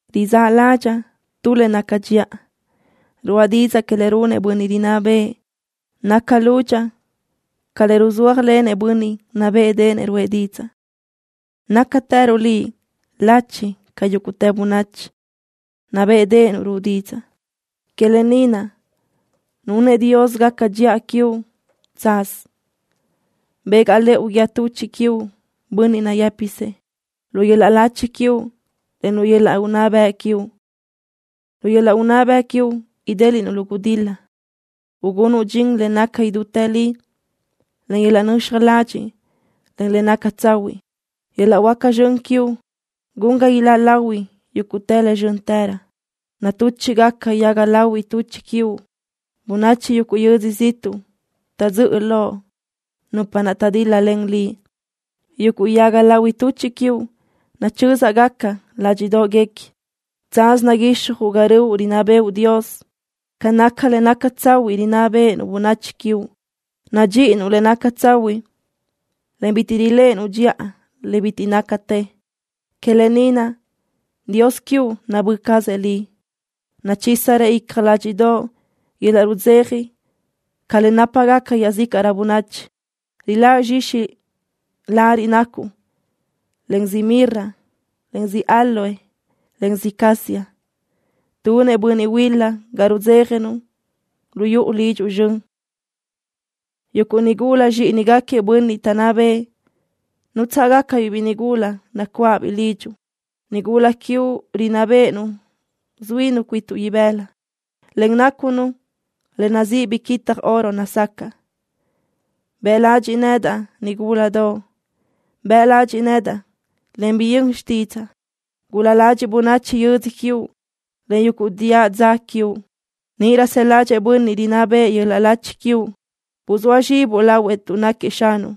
Rizáʼ ládxaʼa tu le naca dxiʼa. Ruʼa didzaʼ que le runëʼ bönniʼ rinná bëʼë. Naca lúdxaʼa ca le ruzúajlenëʼ bönniʼ nabéʼedeʼenëʼ ruʼë didzaʼ. Nácatëruʼ Liʼ lachi ca yúguʼtë bönachi. Nabéʼedeʼenuʼ ruʼu didzaʼ. Que lë ni naʼ nunëʼ Dios gaca dxiʼa quiuʼ chadía chacanna. Begaʼ lëʼu guíë tuchiʼ quiuʼ, bönniʼ nayë́pisëʼ, lu yöl-laʼ lachi quiuʼ, en lu yöl-laʼ unná bëʼ quiuʼ. Lu yöl-laʼ unná bëʼ quiuʼ idéliʼnuʼ lu gudil-la, ugunuʼ dxin le naca idútë li, en yöl-laʼ nöxaj ladxiʼ, en le naca tsahuiʼ. Yöl-laʼ huáca zxön quiuʼ gun ga iláʼ lahui yuguʼ le zxö́ntërö. Natúchiʼgacadaʼ yaga lahui tuchiʼ quiuʼ. Bönachi yuguʼ yödzö ziʼtuʼ taʼdzö́ʼö loʼ, nupa naʼ taʼdíl-lalen liʼ. Yuguʼ yaga lahui tuchiʼ quiuʼ nachö́zaʼgaca ládxiʼdoʼguequi. ¡Chadía chacanna naguixjuʼ ga röʼu rinná bëʼu, Dios! ¡Ca naca le naca tsahuiʼ rinná béʼenuʼ bönachi quiuʼ! Nadxíʼinuʼ le naca tsahuiʼ, en bitiʼ riléʼenuʼ dxiʼa le bitiʼ nácatë. Que lë ni naʼ Dios quiuʼ nabö́ cazëʼ liʼ. Nachízirëʼ icja ládxiʼdoʼo yöl-laʼ rudzeja ca le nápagaca iaʼzícaʼrö bönachi. Riláʼ zxixi lariʼ nacuʼ len ziʼ mirra, en ziʼ áloe, en ziʼ casia. Tunëʼ bönniʼ huil-la ga rudzéjanuʼ lu yuʼu lidxuʼ zxön. Yuguʼ nigula zxíʼinigaquiëʼ bönniʼ taʼnná bëʼë nútsaʼgacabiʼ biʼi nigula nacuáʼabiʼ lidxuʼ. Nigula quiuʼ rinná béʼenu zuínu cuituʼ ibëla, en nácunu le nazíʼi biquitaj oro nazacaʼ. Bëʼ ladxiʼ nedaʼ, nigúladoʼ. Bëʼ ladxiʼ nedaʼ, en biyö́n xtídzaʼa. Gul-la ladxiʼ bönachi yödzö quiuʼ, en yuguʼ diʼa dza quiuʼ. Níʼirö së ládxëʼë bönniʼ rinná bëʼë yöl-laʼ lachi quiuʼ. Buzóa zxibuʼ lahuëʼ tuʼ náquiëʼ xanuʼ.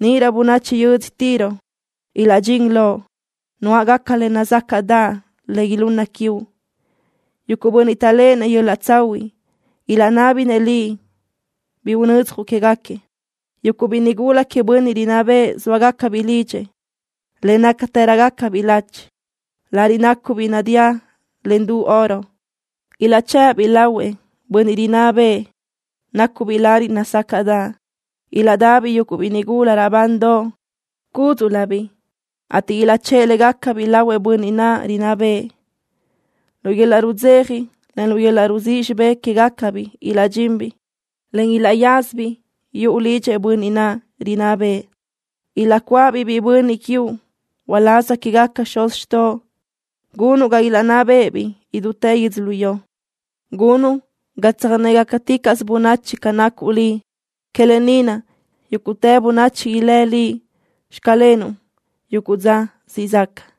Níʼirö bönachi yödzö Tiro ilaʼdxín loʼ nuáʼgaca le nazácaʼdaʼ le ilunna quiuʼ. Yuguʼ bönniʼ taʼléʼenëʼ yöl-laʼ tsahuiʼ ilaʼnábinëʼ liʼ bi unödzjuʼ quégaquiëʼ. Yuguʼ biʼi nigula queëʼ bönniʼ rinná bëʼë zóagacabiʼ lidxëʼ, en nácatërögacabiʼ lachi. Lariʼ nácubiʼ nadíalen du oro. Ilaʼchë́ʼë-biʼ lahuëʼ bönniʼ rinná bëʼë, nácubiʼ lariʼ nazácaʼdaʼ. Ilaʼdabiʼ yuguʼ biʼi nigula raʼbandoʼ cúdziʼlöbiʼ, ateʼ ilaʼchë́ʼë légacabiʼ lahuëʼ bönniʼ naʼ rinná bëʼë. Lu yöl-laʼ rudzeja, en lu yöl-laʼ ruzíʼ xibé quégacabiʼ ilaʼdxinbiʼ, en ilaʼyázabiʼ yuʼu lidxëʼ bönniʼ naʼ rinná bëʼë. Ilaʼcuáʼabiʼ biʼi bönniʼ quiuʼ uláz quégaquiëʼ xuz xtoʼo. Gunuʼ ga ilaʼnná bë́ʼëbiʼ idútë yödzölió. Gunuʼ ga tsöjnégacaticaʼsö bönachi ca nacuʼ Liʼ. Que lë ni naʼ yúguʼtë bönachi ilë́ liʼ “Xclenuʼ” yuguʼ dza siʼ zaca.